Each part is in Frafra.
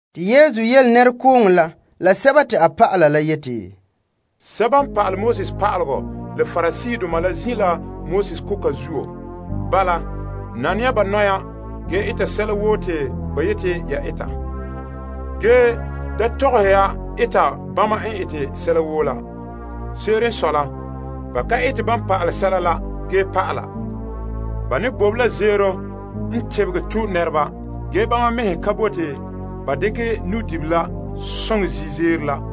Yesu nya yele nɛrekooŋɔ la la a dɔlɔba la yeti, Pa'alegɔ pa'aleba la Pariseedoma la zin' la Moses koka zuo. Bala, nane ya ba nɔya ge eta sɛla woo te ba yeti ya eta. Ge da tɔgɔhe ya eta bama n ete sɛla woo la. Se'ere n sɔe la, ba ka ete ban pa'ale sɛla la. Ba ne bobe la zeero n tebegɛ to' nɛreba ge bama mɛhe ka bote ba dekɛ nu'dibila soŋe zi zeero la.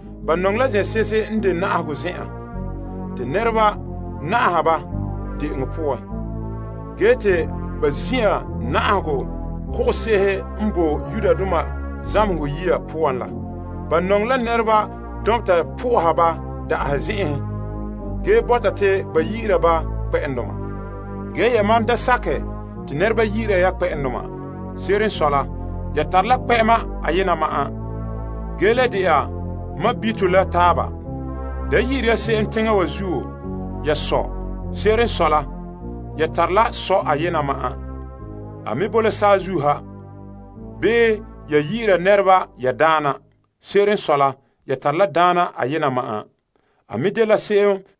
Ba nɔŋɛ la zen'se'ehe n de na'ahegɔ zen'an, te nɛreba na'aha ba de'enɔ poan, ge te ba zin'an na'ahegɔ kogose'ehe n boe zamehegɔ yiya poan la. Ba nɔŋɛ la nɛreba dɔnbeta po'oha ba da'ahe zen'en, ge bɔta te ba yi'ira ba Naa. Ge da sakɛ te ba yi'ira ya Naa. Se'ere n sɔe la, ya tare la Daana ayena ma'an, ge yamam le dɛna sɔɔnrɔ la taaba. Da yi'ire ya se'em n boe teŋa wa zuo ya sɔ. Se'ere n sɔe la, ya tare Sɔ' ayena ma'an ge enŋa boe la saazuo ha. Bii da sakɛ ba yi'ira ya pa'ala. Se'ere n sɔe la, ya tare la Pa'ala ayema ma'an. A me dela Krista.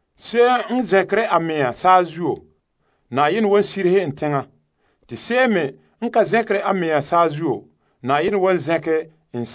Se'em n zɛnkere a mea, Yenɛ wan sirihe en. Te se'em me n ka zɛnkere a mea, Na'ayenɛ wan tee zɛnkɛ en.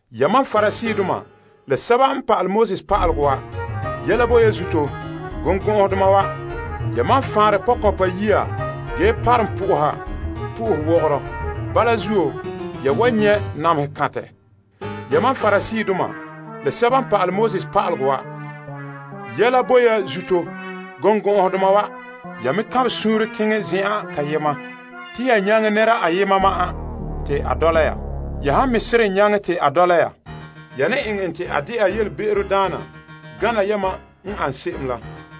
Pa'alegɔ pa'aleba la Pariseedoma, yɛla bo ya zuto, birikɔgɔdoma wa! Yamam n faanre pɔkɔnpa yiya ge parom po'oha po'ohowogoro. Bala zuo, ya wan nyɛ' namehe kantɛ. Pa'alegɔ pa'aleba la Pariseedoma, yɛla bo ya zuto, birikɔgɔdoma wa! Ya kanbɛ suunre keŋɛ zen'an kayema te ya nyaŋɛ nɛra ayema ma'an te a dɔla ya. Ya han nyaŋɛ en te a dɔla ya, ya ne eŋɛ en te a de'a be'emdaana gana yamam n an se'em la.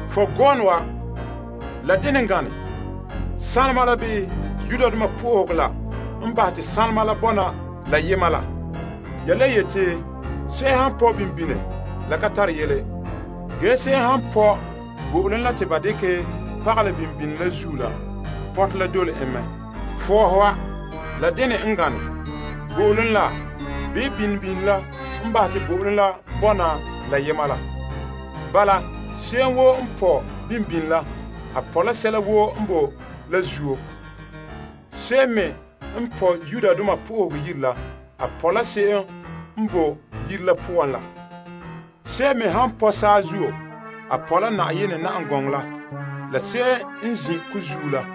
Fɔgɔɔnɔ wa! La dene n gane? Sanlema la bii Yenɛ Yire la n bahɛ te sanlema la dɛna toolom bonɔ? Ya le yeti te se'em han pɔ' kaanbegɔ daka la ka tare yele ge se'em han pɔ' bo'olom la te ba dekɛ pagalɛ daka la zuo la pɔtɛ la dole en mɛ. Fɔɔhe wa! La dene n gane? Bo'olom la bii daka la n bahɛ te bo'olom la dɛna toolom bonɔ? Bala, se'em woo n pɔ' daka la pɔ' la sɛla woo n boe la zuo la. Se'em me n pɔ' Yenɛ Yire la pɔ' la se'em n boe yire la poan la. Se'em me han pɔ' saazuo pɔ' la Na'ayenɛ na'am gɔŋɔ la la se'em n zin' ko zuo la.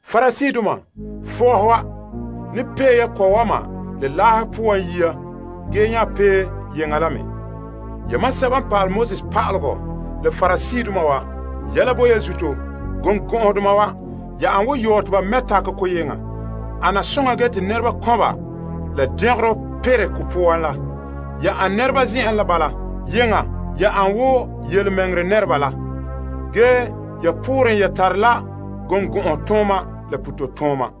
Parisee, fɔɔhe wa! Ne pee ya ko'wanɛ la laa poan yia ge nya pee yeŋa la me. Pa'alegɔ pa'aleba la Pariseedoma, yɛla bo ya zuto, birikɔgɔdoma wa! Ya ane wo yɔɔ te ba mɛ' takɛ te ko yeŋa ana soŋa ge te nɛreba kɔnba la dɛngerɔ perɛ ko poan la. Bala mea nɔɔ, yeŋa ya ane wo tontɔɔdoma la ge ya pooren ya tare la birikɔgɔtooma la be'em.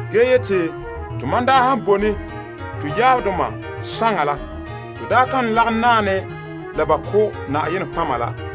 ge yeti, to han daa bone to yaabdoma saŋa la, to daa kan lagom naɛ ne la ba ko' nɔtɔgɔheba la.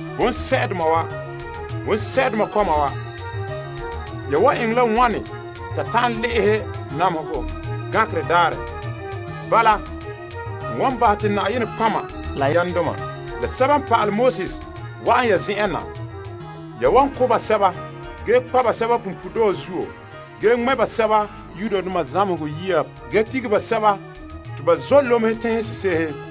Bonsɛ'doma wa! Bonsɛ'doma kɔma wa! Ya wan eŋɛ la wane ta ta'an le'ehɛ namehegɔ gankerɛ daarɛ? Bala, n wan bahɛ te nɔtɔgɔheba la yamdoma la pa'ala la wa'an ya zen'en na. Ya wan ko' basɛba ge kpa' basɛba punpuuredɔɔ zuo ge ŋmɛ' basɛba zamehegɔ yiya ge dige basɛba te ba zɔ' lomehe teŋhe sese'ehe.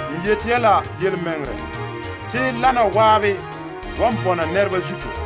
N yeti ya la yelemɛŋɛrɛ te nɛrebana wa ko'a la taala wan bɔna zina nɛreba wa zuto.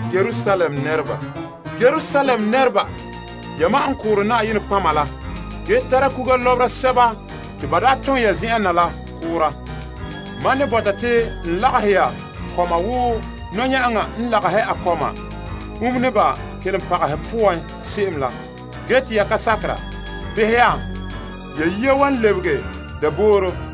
Yerusalem, Yerusalem, ya n ko' nɔtɔgɔheba la ge lobe sɛba te Yenɛ daa tom la. Mam ne bɔta te n lagahɛ ya kɔma wo nɔya'aŋa n ne lagahɛ a kɔma umene a kunkpahɛ poan se'em la ge te ya ka sakera. Behɛ, ho yire wa lebege dabooro.